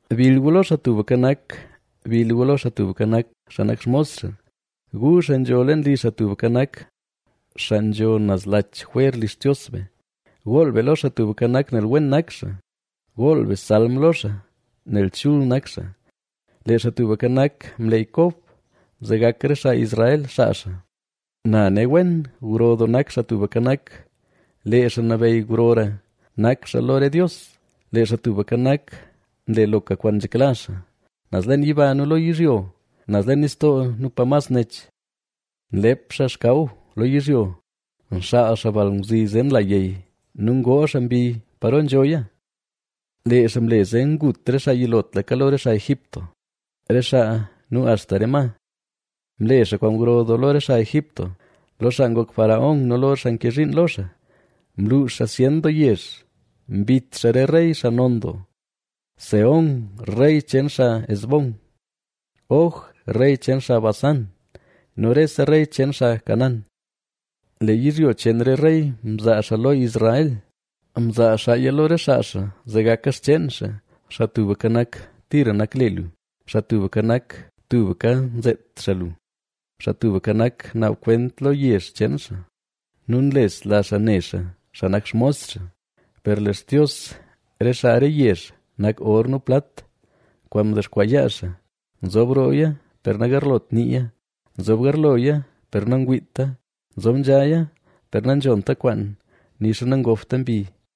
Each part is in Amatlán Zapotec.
¡Bill gu lo Xaa Tubka Nak! ¡Bill gu lo Xaa Tubka Nak! xaa nak xmos xaa, gu, xaa nzho roo li Xaa Tubka Nak, xaa nzho naz lach jwer li Xtios be. Gool be lo Xaa Tubka Nak, nel wen nak xaa; gool be salm lo xaa, nel chul nak xaa. Lee Xaa Tubka Nak mleey Kob, zee gak re xaa Israel xaa xaa. Na ne wen, gro doo nak Xaa Tubka Nak, lee Xaa Nabeyy grora nak xaa lo re dios. Lee Xaa Tubka Nak, nle loka kwaan nzhekla xaa, naz leen yiba nu lo yizhyo, naz leen nistoo nu pa mas nech. Nlep xaa xkaw lo yizhyo, nxaal xaa balngwzi zee nla yey nu ngoo xaa mbi paro nzhoya. Lee xaa mle zee ngut re xaa yilotlaka lo re xaa Egipto, re xaa nu axta re ma. Mle xaa kwaan gro lo re xaa Egipto, lo xaa ngok faraón nu lo xaa nke zhiin lo xaa. Mluux xaa zyen doo yezh, mbit xaa re rey xaa non doo: Sehón, rey cheen xaa Hesbón, Og, rey cheen xaa Basán, nu rese rey cheen xaa Canaán. Lee yizhyo cheen re rey mzaa xaa lo Israel, mzaa xaaya lo re xaa xaa, zee gaka xcheen xaa. Xaa Tubka Nak, tira nak le lu; Xaa Tubka Nak, tubka nzeet xaa lu. Xaa Tubka Nak, naab kwent lo yezh cheen xaa nu nlesla xaa ne xaa, xaa nak xmos xaa. Per lee xtios re xaa re yezh nak or nu plat, kwaan ndexkwaa yaa xaa. Nzob rooya, per nagarlot niiya; nzob garloya, per nangwiita; nzob nzhaya, per nanzhonta kwaan, nixa nangobta mbi.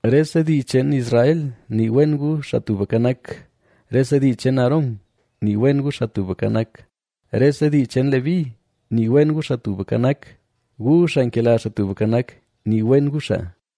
Rese dii cheen Israel, ¡nii wen gu Xaa Tubka Nak! Rese dii cheen Aarón, ¡nii wen gu Xaa Tubka Nak! Rese dii cheen Leví, ¡nii wen gu, Xaa Tubka Nak! gu xaa nkela Xaa Tubka Nak, nii wen gu xaa.